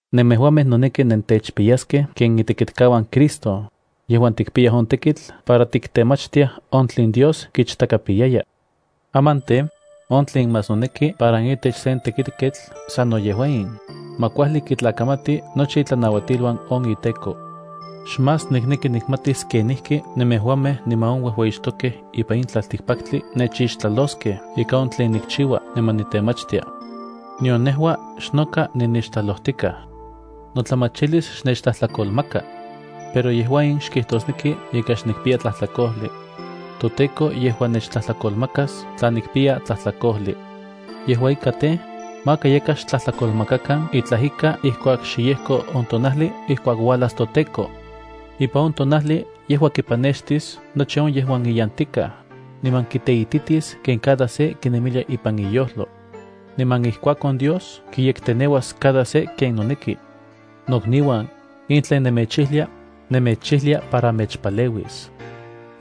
Nemejuamej noneki nentechpiyaskej ken itekitkauan Cristo, yejuan tikpiyaj on tekitl para tiktemachtiaj on tlen Dios kichtakapiyaya. Aman tej, on tlen más noneki para itech sen tekitketl sano yejua in, ma kuajli kitlakamati nochi itlanauatiluan on iteko. Xmás nikneki nikmatis kenijki nemejuamej niman on uejueyixtokej ipan in tlaltikpaktli nechixtlaloskej ika on tlen nikchiua niman nitemachtia. Nion nejua xnoka ninixtlalojtikaj. Notlamachilis xnechtlajtlakolmaka. Pero yejua in xkijtosneki ika xnikpiya tlajtlakojli. ToTEKO yejua nechtlajtlakolmakas tla nikpiya tlajtlakojli. Yejua ika tej, maka yakaj xtlajtlakolmakakan itlaj ika ijkuak xe yejko on tonajli ijkuak uajlas toTEKO. Ipan on tonajli yejua kipanextis nochi on yejuan iyantikaj, niman kiteititis ken cada se kinemilia ipan iyojlo. Niman ijkuakon Dios kiyekteneuas cada se ken noneki. Nokniuan, in tlen nemechijlia, nemechijlia para mechpaleuis.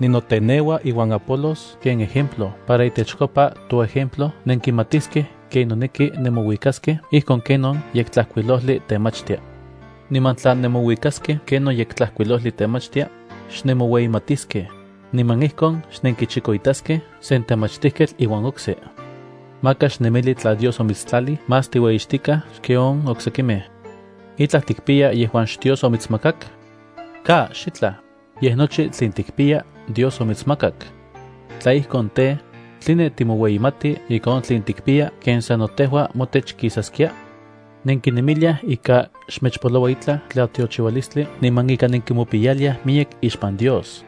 Ninoteneua iuan Apolos ken ejemplo para itechkopa toejemplo nenkimatiskej ken noneki nemouikaskej ijkon ken on Yektlajkuilojli temachtia. Niman tla nemouikaskej ken on Yektlajkuilojli temachtia, xnemoueyimatiskej, niman ijkon xnenkinchikoitaskej sen temachtijketl iuan okse. Maka xnemili tla Dios omitstlalij más tiueyixtikaj xken on oksekimej. ¿Itlaj tikpiya yejuan xDios omitsmakak? ¡Ka, xitlaj! Yej nochi tlen tikpiya Dios omitsmakak. Tla ijkon tej, ¿tline timoueyimati ika on tlen tikpiya ken sano tejua motech kisaskia? Nenkinemiliaj ika xmechpoloua itlaj tlatiochiualistli niman ika nenkimopiyaliaj miyek ixpan Dios.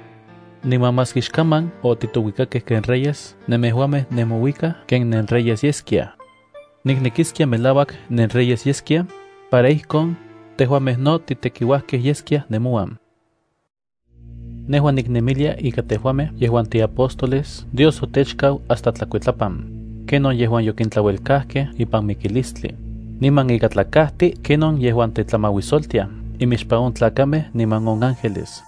Niman maski xkaman otitouikakej ken reyes, nemejuamej nemouikaj ken nenreyes yeskiaj. Niknekiskia melauak nenreyes yeskiaj, para tla ijkon, tejuamej no titekiuajkej yeskiaj nemouan. Nejua niknemilia ika tejuamej yejuan tiapóstoles Dios otechkau hasta tlakuitlapan, ken on yejuan yokintlauelkajkej ipan mikilistli, niman ika tlakajti ken on yejuan tetlamauisoltiaj imixpan on tlakamej niman on ángeles.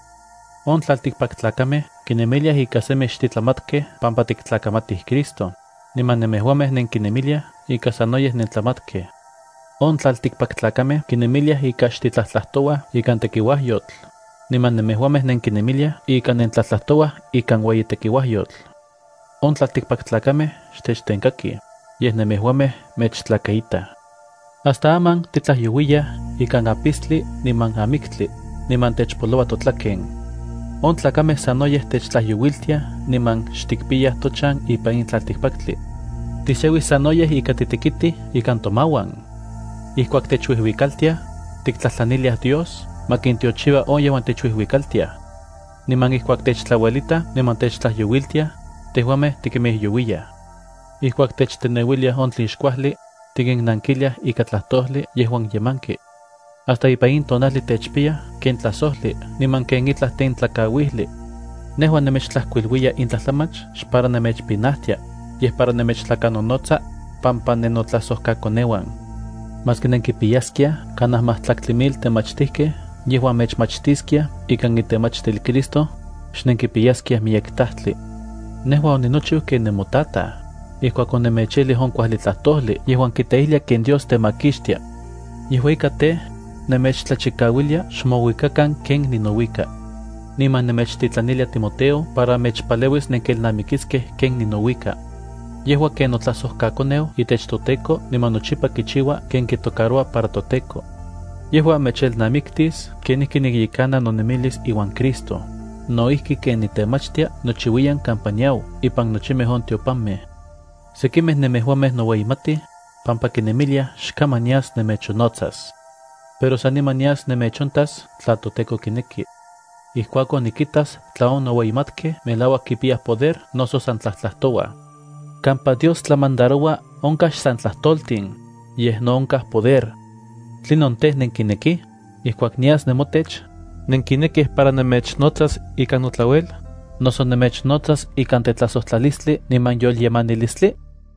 On tlaltikpaktlakamej kinemiliaj ika semi xtitlamatkej pampa tiktlakamatij Cristo, niman nemejuamej nenkinemiliaj ika sanoyej nentlamatkej. On tlaltikpaktlakamej kinemiliaj ika xtitlajtlajtouaj ikan tekiuajyotl, niman nemejuamej nenkinemiliaj ika nentlajtlajtouaj ikan ueyi tekiuajyotl. On tlaltikpaktlakamej xtechtenkakij, yej nemejuamej mechtlakaitaj. Hasta aman titlajyouiyaj ikan apistli niman amiktli, niman techpoloua totlaken. On tlakamej sanoyej techtlajyouiltiaj niman xtikpiyaj tochan ipan in tlaltikpaktli. Tisiauij sanoyej ika titekitij ikan tomauan. Ijkuak techuijuikaltiaj, tiktlajtlaniliaj Dios ma kintiochiua on yejuan techuijuikaltiaj. Niman ijkuak techtlauelitaj niman techtlajyouiltiaj, tejuamej tikimijyouiyaj. Ijkuak techteneuiliaj on tlen xkuajli, tikinnankiliaj ika tlajtojli yejuan yemanki. Hasta ipan in tonajli techpiyaj ken tlajsojli niman ken itlaj tentlakauijli. Nejua nemechtlajkuiluiya in tlajtlamach xpara nemechpinajtia, yej para nemechtlakanonotsa, pampa nennotlajsojkakoneuan. Maski nenkipiyaskiaj kanaj majtlaktli mil temachtijkej yejuan mechmachtiskiaj ikan itemachtil Cristo, xnenkipiyaskiaj miyek tajtli. Nejua oninochiu ken nemotataj, ijkuak onemechijlij on kuajli tlajtojli yejuan kiteijlia ken Dios temakixtia. Yejua ika tej, nemechtlachikauilia xmouikakan ken ninouika. Niman nemechtitlanilia Timoteo para mechpaleuis nenkelnamikiskej ken ninouika. Yejua ken notlajsojkakoneu itech toTEKO niman nochipa kichiua ken kitocaroua para toTEKO. Yejua mechelnamiktis kenijki nikyekana nonemilis iuan Cristo, no ijki ken nitemachtia nochiuiyan kampa niau ipan nochimej on tiopanmej. Sekimej nemejuamej noueyimatij, pampa kinemiliaj xkaman nias nemechonnotsas. Pero saniman nias nemechontas tla toTEKO kineki. Ijkuakon nikitas tla on noueyimatkej melauak kipiyaj poder noso san tlajtlajtouaj. Kampa Dios tlamandaroua onkaj xsan tlajtoltin, yej no onkaj poder. ¿Tlinon tej, nenkinekij? Ijkuak nias nemotech, ¿nenkinekij para nemechnotsas ikan notlauel, noso nemechnotsas ikan tetlajsojtlalistli niman yolyemanilistli?